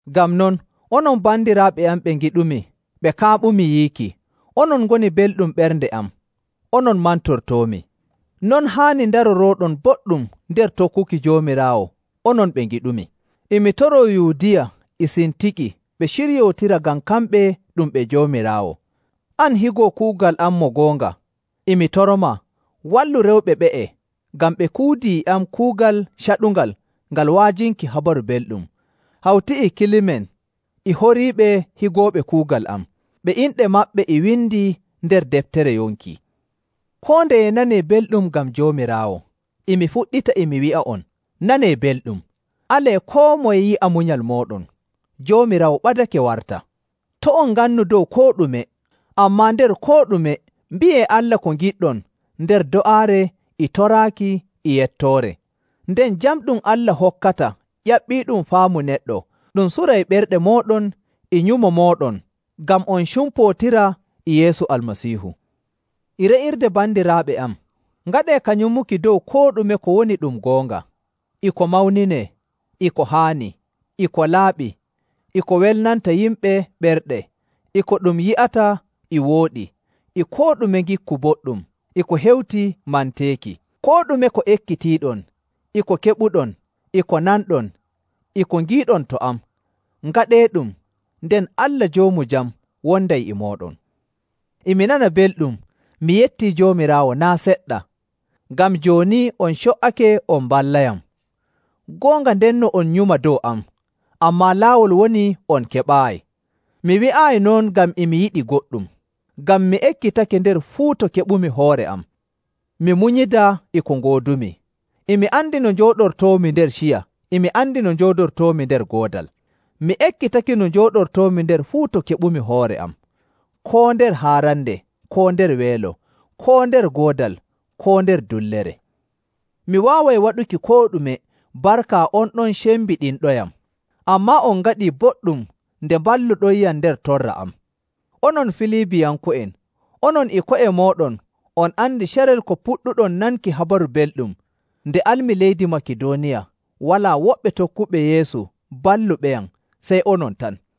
Ngam non, onon bandiraaɓe am ɓe ngiɗumi ɓe kaaɓumi yiiki, onon ngoni belɗum ɓernde am, onon mantortoomi. Non haani ndarorooɗon boɗɗum nder tokkuki Joomiraawo, onon ɓe ngiɗumi. E mi toroo Yuudiya e Sintiki ɓe ciryootira ngam kamɓe ɗum ɓe Joomiraawo. An higo kuugal am mo goonga, e mi toromaa, wallu rewɓe ɓe'e, ngam ɓe kuudii e am kuugal caɗungal ngal wa'ajinki Habaru Belɗum, hawti e Kilemen e horiiɓe higooɓe kuugal am, ɓe inɗe maɓɓe e windii nder deftere yonki. Koo ndeye nanee belɗum ngam Joomiraawo. E mi fuɗɗita e mi wi'a'on, nanee belɗum! Alee koo moye yi'a munyal mooɗon. Joomiraawo ɓadake wara. To' on ngannu dow koo ɗume, ammaa nder koo ɗume mbi'ee Allah ko ngiɗɗon nder do'aare e toraaki e yettoore. Nden jam ɗum Allah hokkata ƴaɓɓiiɗum faamu neɗɗo ɗum suray ɓerɗe mooɗon e nyumo mooɗon ngam on cumpootira e Yeesu Almasiihu. E re'irde bandiraaɓe am, ngaɗee ka nyumuki dow koo ɗume ko woni ɗum goonga, e ko mawninee, e ko haani, e ko laaɓi, e ko welnanta yimɓe ɓerɗe, e ko ɗum yi'ata e wooɗi, e koo ɗume ngikku boɗɗum, e ko hewti manteeki. Koo ɗume ko ekkitiiɗon, e ko keɓuɗon, e ko nanɗon, e ko ngiiɗon to am, ngaɗeeɗum, nden Allah Joomu Jam wonday e mooɗon. E mi nana belɗum, mi yettii Joomiraawo naa' seɗɗa, ngam jooni on co''ake on mballayam. Goonga ndenno on nyuma dow am, ammaa laawol woni on keɓaayi. Mi wi'aayi non ngam e mi yiɗi goɗɗum. Ngam mi ekkitake nder fuu to keɓumi hoore am mi munyida e ko ngoodumi. E mi andi no njooɗortoomi nder ciya, e mi andi no njooɗortoomi nder goodal. Mi ekkitake no njooɗortoomi nder fuu to keɓumi hoore am, koo nder haarande, koo nder weelo, koo nder goodal, koo nder dullere. Mi waaway waɗuki koo ɗume barka on ɗon cembiɗinɗoyam. Ammaa on ngaɗii boɗɗum nde mballuɗoyyam nder torra am. Onon Filibiyanko'en, onon e ko'e mooɗon on andi carel ko puɗɗuɗon nanki Habaru Belɗum, nde almi leydi Makidooniya, walaa woɓɓe tokkuɓe Yeesu balluɓeyam sey onon tan.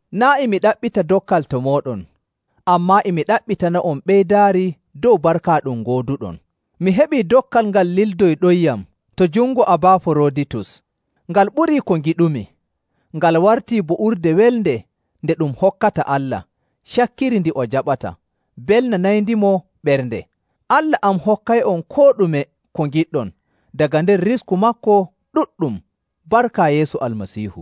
Naa' e mi ɗaɓɓita dokkal to mooɗon, ammaa e mi ɗaɓɓitana'on ɓeydaari dow barka ɗum ngooduɗon. Mi heɓii dokkal ngal lildoyɗoyyam to jungo Abaaforoditus. Ngal ɓuri ko ngiɗumi. Ngal wartii bo urde welnde nde ɗum hokkata Allah, cakkiri ndi o jaɓata, mbelnanayndimo ɓernde.. Allah am hokkay'on koo ɗume ko ngiɗɗon daga nder risku maako ɗuɗɗum barka Yeesu Almasiihu.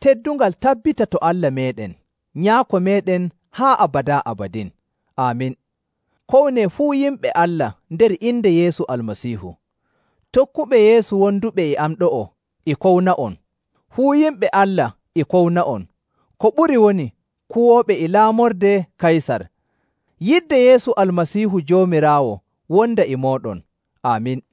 Teddungal tabbita to Allah meeɗen, Nyaako meeɗen haa abadaa abadin! Aamin. Kownee fuu yimɓe Allah nder inde Yeesu Almasiihu. Tokkuɓe Yeesu wonduɓe e am ɗo'o e kowna'on. Fuu yimɓe Allah e kowna'on, ko ɓuri woni kuwooɓe e laamorde Kaysar. Yidde Yeesu Almasiihu Joomiraawo wonda e mooɗon. Aamin.